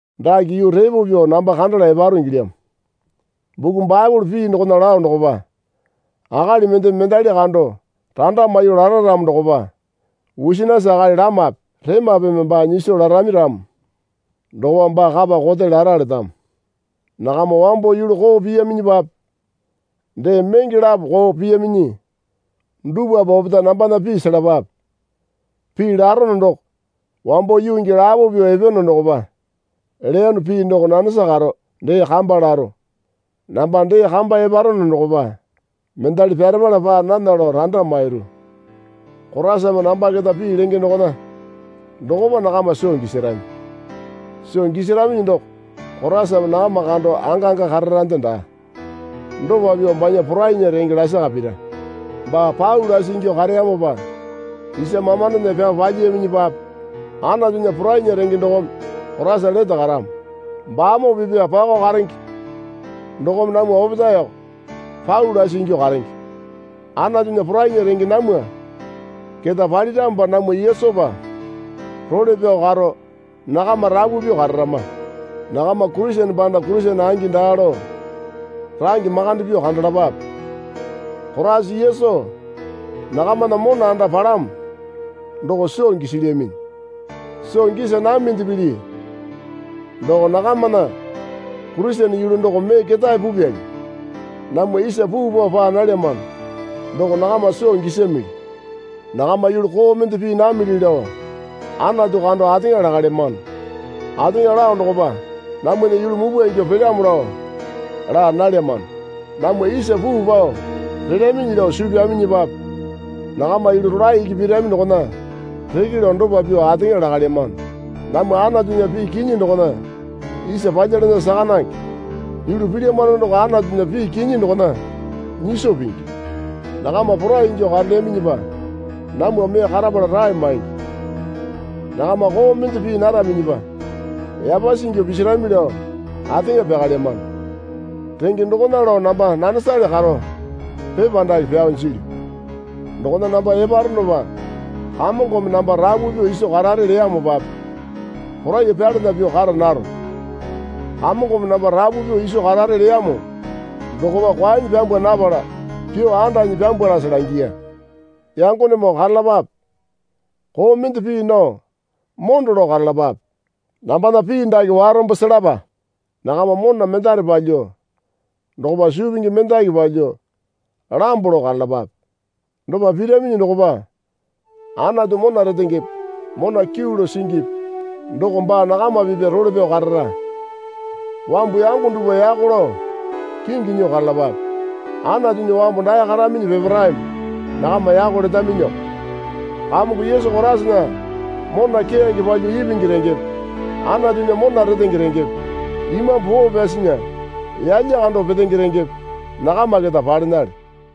Dake yuu repo pyuo namba kandala eparo ingilyamo. Buku Baepole pii dokona lao dokopa. Akali mendeme mendali kando randa maiyuo lara ramo dokopa wusinisi akali lamape remapeme baa nyiso larami ramo dokopa baa kapa kote lara letamo. Nakama wambo yulu koo piyaminyipape dee menge lapo koo piyaminyi dupwape opetae nambana pii selapape. Pii larono doko wambo yuu gii lapo pyuo epeyono dokopa leyono pii doko nanesa karo dee kamba laro. Namba dee kamba eparono dokopa mendali pyarepala paa nana lao randa mairu. Koraisame namba keta pii lenge dokona dokopa nakama soo gisarami. Soo gisaraminyi doko Koraisame nakama kando angangi kararande daa. Dopa pyuo banya porainya renge lasaka pira. Baa pau lasi ingyuo kareyamopa isa mamandona pyao palyiyaminyipape Anatunya porainya renge dokome Koraisa lete karamo. Baamoo pipya pakao karenge dokome namwa opetaeko pau lasi ingyuo karenge. Anatunya porainya renge namwa keta paliramopa namwa Yesupa role pyao karo nakama rapu pyuo kararama. Nakama Kurisene panda Kurisene angi daa lao range makande pyuo kandalapape. Koraisa Yesu nakamana mona anda palamo doko soo gisilyaminyi. Soo gisa naminde pili doko nakamana Kurisene yulu doko mee ketae pupyali. Namwa isa puu pao paa nalyamano doko nakama soo gisamili. Nakama yulu koo mende pii namili lao Anatu kando ateŋa lakalyamano. Ateŋa lao dokopa namwana yulu mupwa ingyuo pelyamo lao laa nalyamano. Namwa isa puu pao pelyaminyi lao suu pyaminyipape nakama yulu rolae iki pirami dokona reke lao dopa pyuo ateŋa lakalyamano. Namwa Anatunya pii kinyi dokona isa palyalana saka nange. Yulu pilyamano doko Anatunya pii kinyi dokona nyiso pingi. Nakama porai ingyuo karelyaminyipa namwa mee karapala rae maingi. Nakama koo mende pii naraminyipa yapasi ingyuo pisirami lao ateŋa pyakalyamano. Renge dokona lao namba nanesale karo pepa dake pyao jilyu. Dokona namba eparonopa Kamongome namba rapu pyuo iso karare leyamopape poraiyuo pyalana pyuo kara naro. Kamongome namba rapu pyuo iso karare leyamo dokopa kwaenyi pyambwa napala pyuo andanyi pyambwalase langiya. Yangonemoo karalapape. Koo mende pii nao mondo lao karalapape. Nambana pii dake warombo selapa. Nakama mona mendare palyuo dokopa suu pingi mendaki palyuo lambo lao karalapape. Dopa piraminyi dokopa Anatu mona retengepe mona kyuu lao singipi doko baa nakama pipya role pyao karara. Wambu yango dupwa yako lao kingi nyuo karalapape. Anatunya wambu dae karaminyi peparaeme nakama yako letaminyiko. Kamongo Yesu Koraisana mona keyange palyuo ipingi rengepe Anatunya mona retenge rengepe Imambu Poo Pyasinya yalya kando petenge rengepe nakama keta palenale.